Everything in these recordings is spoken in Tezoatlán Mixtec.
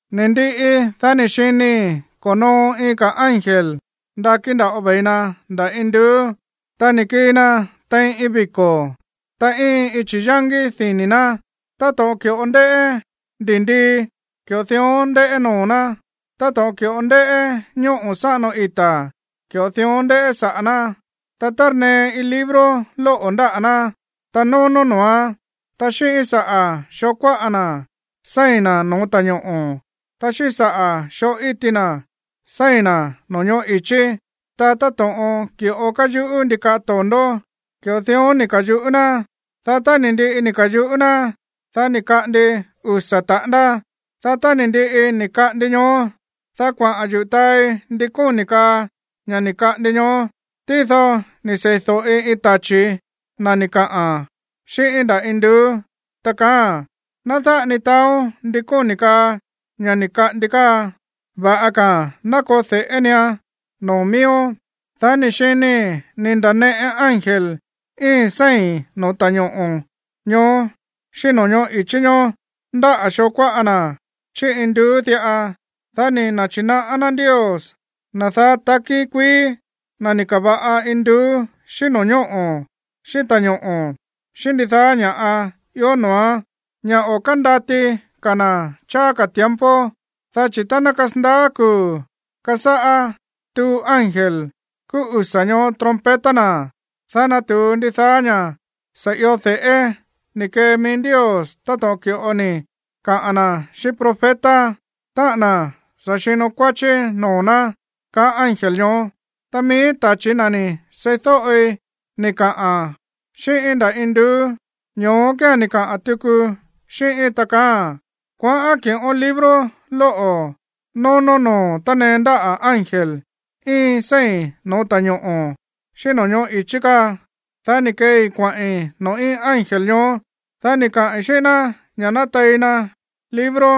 Ni̱ ndiꞌi, dá ni̱ xinii̱ ko̱noo iin ka̱ ángel ndakí nda̱ꞌo ve̱i na nda̱ induú, ta ni̱ kii na tein iin viko̱, ta íin iin chi̱yángí dini̱ ná. Táto̱ꞌon ki̱ꞌo ndéꞌé ndi̱ndii, ki̱ꞌo dión ndéꞌé noo̱ ná. Táto̱ꞌon ki̱ꞌo ndéꞌé ñóꞌo̱ sáꞌano ita̱, ki̱ꞌo dión ndéꞌé saꞌa̱ ná. Ta tárnee iin libro lóꞌo̱ ndáꞌa̱ ná, ta nónó noo̱án. Ta xíꞌín saꞌa̱ xoo kuáꞌa na̱ séi̱n na̱ no̱ó ta̱ñoꞌo̱, ta xíꞌín saꞌa̱ xoo íti na̱ séi̱n na̱ no̱ñóꞌo̱ i̱chí. Ta táto̱ꞌon ki̱ꞌo káyuꞌú ndikaꞌa to̱ndó, ki̱ꞌo dión ni̱ ka̱yuꞌú ná. Dá tá ni̱ ndiꞌi ni̱ ka̱yuꞌú ná, dá ni̱ kaꞌandi usa̱ taꞌándá. Dá tá ni̱ ndiꞌi ni̱ kaꞌandi ñoó, dá kuaꞌa̱n yuꞌu̱ taai ndi kóni̱ kaa ña̱ ni̱ kaꞌandi ñoó. Tído ni̱ sei̱do̱ꞌi iin tachi̱ na̱ ni̱ kaꞌa̱n xíꞌíín nda̱ induú, ta kaáa̱n: ―Ná dáꞌa ni taaón ndi kóni̱ kaa ña̱ ni̱ kaꞌandi káa. Va̱ꞌa ka̱a̱n ná koo de̱ꞌé nian noo̱ mííón. Dá ni̱ xinii̱ ni̱ nda̱neꞌe ángel íin séi̱n no̱ó ta̱ñoꞌo̱ ñoó xíꞌín no̱ñóꞌo̱ i̱chí ñoó ndáꞌa̱ xoo kuáꞌa na̱ chí induú diꞌa, dá ni̱ na̱chi̱naꞌá ná Ndios, na̱ daá takí kuií, na̱ ni̱ ka̱va̱ꞌa induú xíꞌín no̱ñóꞌo̱ xíꞌín ta̱ñoꞌo̱, xíꞌín ndidaá ña̱ꞌa ió noo̱án, ña̱ o̱ kándati ka̱ na̱ cháá ka̱ tiempo, dá chi̱ tá ná kasandaá kuu̱ kasáꞌá tuu ángel kúú usa̱ ñoó trompeta na̱, dá natu̱u ndidaá ña̱ sa̱ io de̱ꞌé ni̱ kee mií Ndios táto̱ꞌon ki̱ꞌo ni̱ kaa na̱ xíꞌín profeta, táꞌa̱n na̱ sa̱ xino kuáchí noo̱ ná, kaá ángel ñoó. Ta mií tachi̱ na̱ ni̱ seídóꞌi ni̱ kaꞌa̱n xíꞌíín nda̱ induú, ño̱ó kía̱n ni̱ kaꞌa̱n tuku xíꞌíín, ta kaáa̱n: ―Kuaꞌán kiꞌón libro lóꞌo̱ nónó noo̱ tánee ndáꞌa̱ ángel íin séi̱n no̱ó ta̱ñoꞌo̱ xíꞌín no̱ñóꞌo̱ i̱chí káa. Dá ni̱ keei kuaꞌi̱n noo̱ íin ángel ñoó. Dá ni̱ kaai̱ xíꞌín ná ña̱ ná tei na libro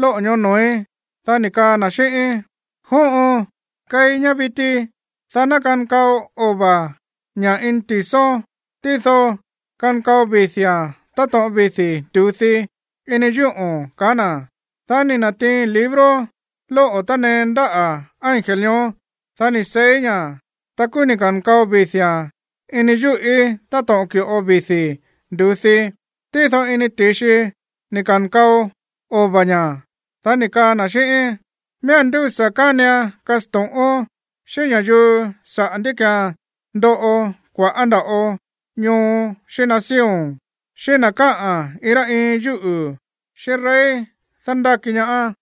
lóꞌo̱ ñoó noo̱í. Dá ni̱ kaa na̱ xíꞌíín: ―Jóꞌon, keí ñá viti, dá ná kankao ova̱ ña̱ ini ti̱són, tído kankao vidi̱a̱n táto̱ꞌon vidi̱ ndu̱dí ini yúꞌo̱n ―kaá na̱. Dá ni̱ na̱tiiin libro lóꞌo̱ tánee ndáꞌa̱ ángel ñoó. Dá ni̱ seíí ña̱. Ta kúú ni̱ ka̱nkao vidi̱a̱n ini yúꞌí táto̱ꞌon ki̱ꞌo vidi̱ ndu̱dí, tído ini ti̱xi ni̱ ka̱nkao ova̱ ña̱. Dá ni̱ kaa na̱ xíꞌíín: ―Miía̱n ndúsa̱ kánian kasto̱ꞌón xíꞌín ña̱yuu sa̱ꞌá ndí ki̱án ndoꞌo kua̱ꞌá nda̱ꞌo ñoo xíꞌín nación, xíꞌín na̱ káꞌa̱n iin rá iin yúꞌu̱, xíꞌín rey dándáki ñaá.